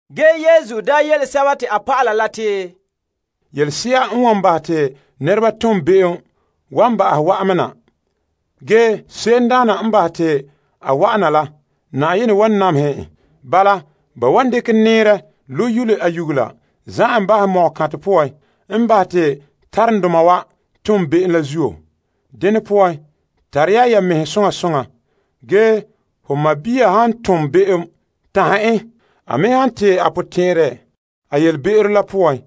Yesu yele a dɔlɔba la te, Yelese'a n wan bahɛ te nɛreba ton be'em wan ba'ahom wa'an me na. Ge se'emdaana n bahɛ te a wa'an na la, Na'ayenɛ wan namehɛ en. Bala, ba wan dekɛ nɛɛrɛ lo' yule a nyugela za'ɛ en bahɛ mɔgɔkantɛ poan, la en bahɛ te taromdoma wa ton be'em la zuo. Dene poan, tare ya ya mɛhe soŋa soŋa. Ge ho sɔɔn han tom be'em, tanhɛ en. A me han tee a potɛn'ɛrɛ a yelebe'ero la poan,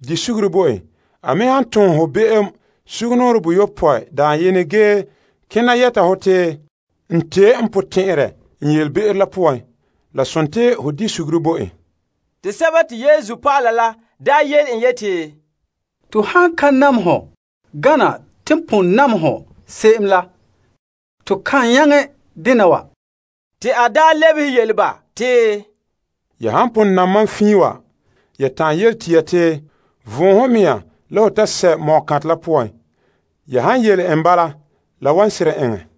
di suguru bo en. A me han tom ho be'em sugumnɔɔren boyopɔe dayenɛ ge kena yɛta hɔ te, N tee n potɛn'ɛrɛ n yelebe'ero la poan, la sontii ho di suguru bo en. Te Yesu dɔlɔba la yele en yeti, To han ka nam hɔ gana te pon nam hɔ se'em la, to kan nyaŋɛ dena wa. Te a lebehe yele ba te, Ya han pon nam mam fiin wa ge ya ta'an yele tia te, Von ho mea la ho ta sɛ' mɔgɔkantɛ la poan. Ya han yele n bala, la wan seren eŋɛ.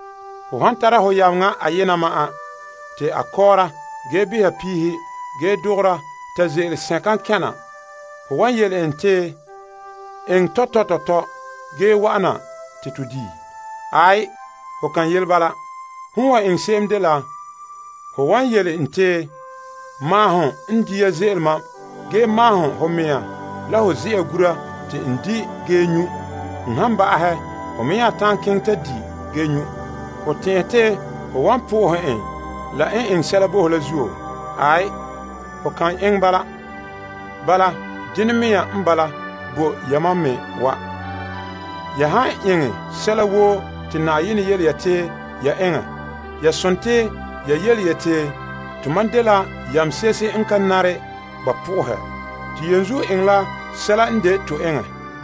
Ho han tara ho yameŋa ayena ma'an te a kɔɔra ge beha piihe, ge dogora ta ze'ele sɛnkan kɛn' na, ho wan yele en te, Eŋɛ tɔtɔ tɔtɔ ge wa'ana te to di'? Aai, ho kan yele bala. Hom n wan eŋɛ se'em dela ho wan yele en te, Maahom n dia ze'ele mam ge maahom ho mea la ho ze'a gura te n di' ge nyu'. N han ba'ahɛ, hon me nya ta'an keŋɛ ta di' ge nyu'. Ho tɛn'ɛhɛ te ho wan po'ohɛ en la n eŋɛ sɛla bo ho la zuo? Aai, ho kan eŋɛ bala. Bala, dene mea n bala bo yamam me wa. Ya han eŋɛ sɛla woo te Na'ayenɛ yele ya te ya eŋɛ, ya sontii ya yeti, tomam dela yamse'ehe n ka nare ba po'ohɛ. To yenzuo eŋɛ la sɛla n de to eŋɛ.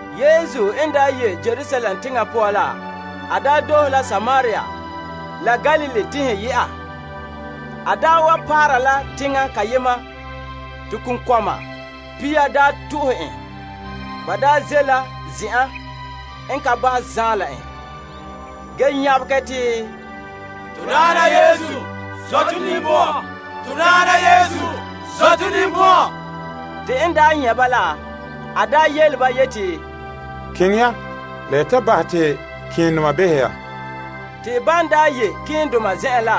Yesu n daa ye' Yerusalem teŋa poan la, a doohe la Samaria la Galilee teŋhe yɛ'a. A paara la teŋa kayema te konkɔma pia to'ohɛ en. Ba ze' la zen'an n ka ba' zaan la en, ge nyabegɛ te, To Daana Yesu, zɔ' to ninbɔn'ɔn. Te n nyɛ' ba la, a yele ba yeti, Keŋɛ ya la ya ta bahɛ te malemadoma behɛ ya. Te ban ye' malemadoma zen'en la,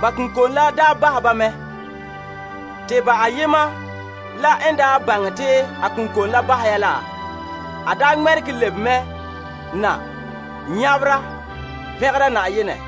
ba konkom la bahɛ ba mɛ. Te ba ayema la n baŋɛ te a konkom la bahɛ ya la, a ŋmɛregɛ lebe me na nyabera pɛngera Na'ayenɛ.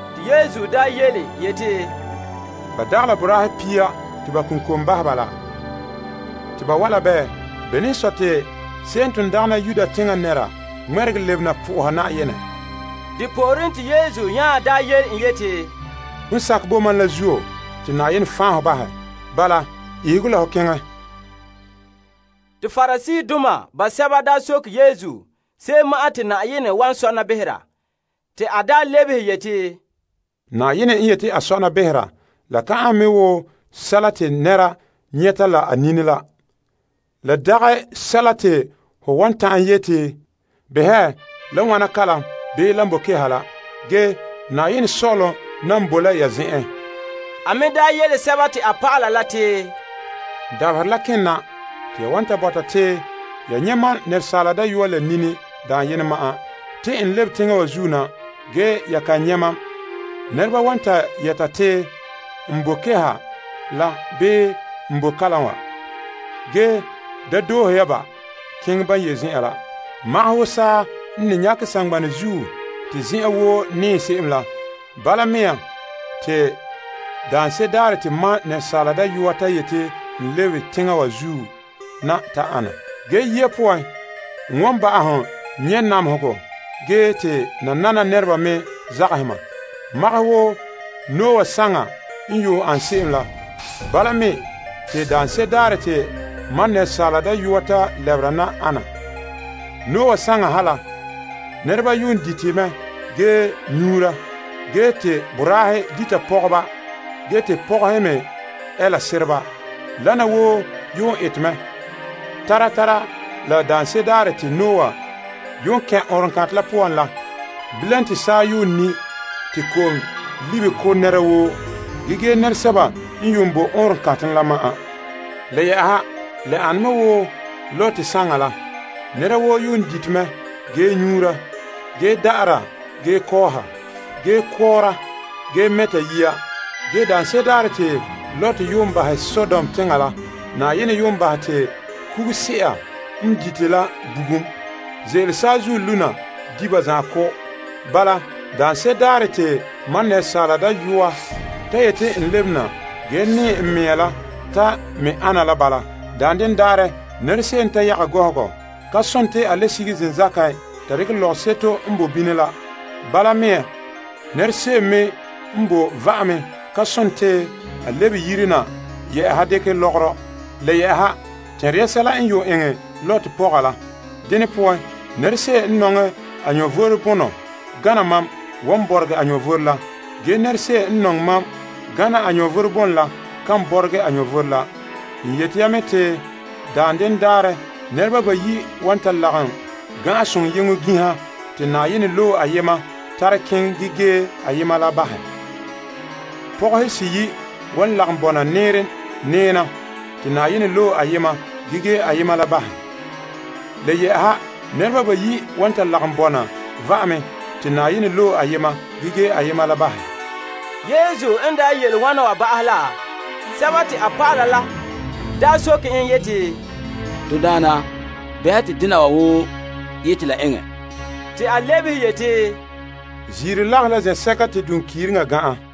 Te Yesu yeti, Ba dagɛ la boraahe pia te ba konkom bahɛ ba laa? Te bawae' la bɛɛ? Bene n sɔe te se'em n ton dagana Yuda teŋa nɛra ŋmɛregɛ lebena po'oha Na'ayenɛ? Te Yesu nya yele en yeti, Hon sakɛ bo mam la zuo te Na'ayenɛ tebɛ hɔ wa. Bala, ihege la ho keŋɛ. Te Pariseedoma basɛba daa soke Yesu se'em ma'an te Na'ayenɛ wan sɔna behera. Te a lebehe yeti, Na'ayenɛ n yete a sɔna behera la ka ane me wo sɛla te nɛreba nyɛta la ba nini la. La dagɛ sɛla te ho wan ta'an yeti, Behɛ, la wana kalam bii lan boe keha la. Ge Na'ayenɛ Sɔ'ɔlom nan boe la ya zen'en. A me nya yele a dɔlɔba la te, Dabaherɛ la kena te ya wan ta bɔta te ya nyɛ' Asaala Dayɔa la nini dayenɛ ma'an, te n lebe teŋa wa zuo na, ge ya kan nyɛ' mam. Nɛreba wan ta yɛta yeti n bo keha la bii n boe kalam wa. Ge da doohe ya ba keŋɛ ban ye' zen'an la. Magahɛ wo saa n ne nyakɛ saŋgbanɛ zuo te zen'en woo nɛɛ se'em la, bala me te daanse'ere daarɛ te Asaala Dayɔa ta yete n lebe teŋa wa zuo na ta ana. Ge yia poan, n wan ba'ahom nyɛ' namehegɔ ge te nanana nɛreba me zagahɛ ma. Magahɛ wo Noah saŋa n yuun an se'em la, bala me te daanse'ere daarɛ te Asaala Dayɔa ta lɛbera na ana. Noah saŋa ha la, nɛreba yuun dite mɛ ge nyuura ge te boraahe dita pɔgɔba ge te pɔgɔhe me ɛɛla sereba. Wana wa woo yuun ete mɛ tara tara la daanse'ere daarɛ te Noah yuun kɛn' ɔɔnrɔŋkantɛ la poan la. Bilam te saa yuun ni' te ko'om libe ko' nɛra woo, ge gee nɛresɛba n yuun boe ɔɔnrɔŋkantɛ la ma'an. Le yɛ'ɛha la ana me wo Lot saŋa la. Nɛra woo yuun dite mɛ ge nyuura, ge da'ara ge kɔɔha, ge kɔɔra ge mɛta yiya. Ge daanse'ere daarɛ te Lot yuun bahɛ Sodom teŋa la, Na'ayenɛ yuun bahɛ te kuguse'a n dite la bugum ze'ele saazuo lu' na di' ba zan'an ko'. Bala, daanse'ere daarɛ te Asaala Dayɔa ta yeti n lebena ge nɛɛ n mea la ta me ana la bala. Daanden daarɛ nɛra se'em n ta yaga gɔhɔgɔ ka sontii a le sige zenzakan ta dekɛ lɔgɔseto n boe bini la. Bala me nɛra se'em me n boe va'ame ka sontii a lebe yire na yɛ'ɛha dekɛ lɔgɔrɔ. Tɛnra ya sɛla n yuun eŋɛ Lot pɔga la. Dene poan, nɛra se'em n nɔŋɛ a vom bonɔ gana mam wan bɔregɛ a vom la. Ge nɛra se'em n nɔŋɛ mam gana a vom bonɔ la kan bɔregɛ a vom la. N yete ya mɛ te daanden daarɛ, nɛreba bayi' wan ta lagom gan'an sonyeŋɔ ginha te Na'ayenɛ loe ayema tare keŋɛ ge gee ayema la bahɛ. Pɔgɔhe seyi' wan ta lagom bɔna nɛɛren nɛɛna te Na'ayenɛ loe ayema ge gee ayema la bahɛ. Le yɛ'ɛha nɛreba bayi' wan ta lagom bɔna va'ame te Na'ayenɛ loe ayema ge gee ayema la bahɛ. Yesu n yele wana ba'ahɛ la, a dɔlɔba la soke en yeti, To Daana bɛha te dena wa woo yete la eŋɛ? Te a lebehe yeti, Ziiro lagahe la zen'sɛka te duŋkiiriŋa gan'an.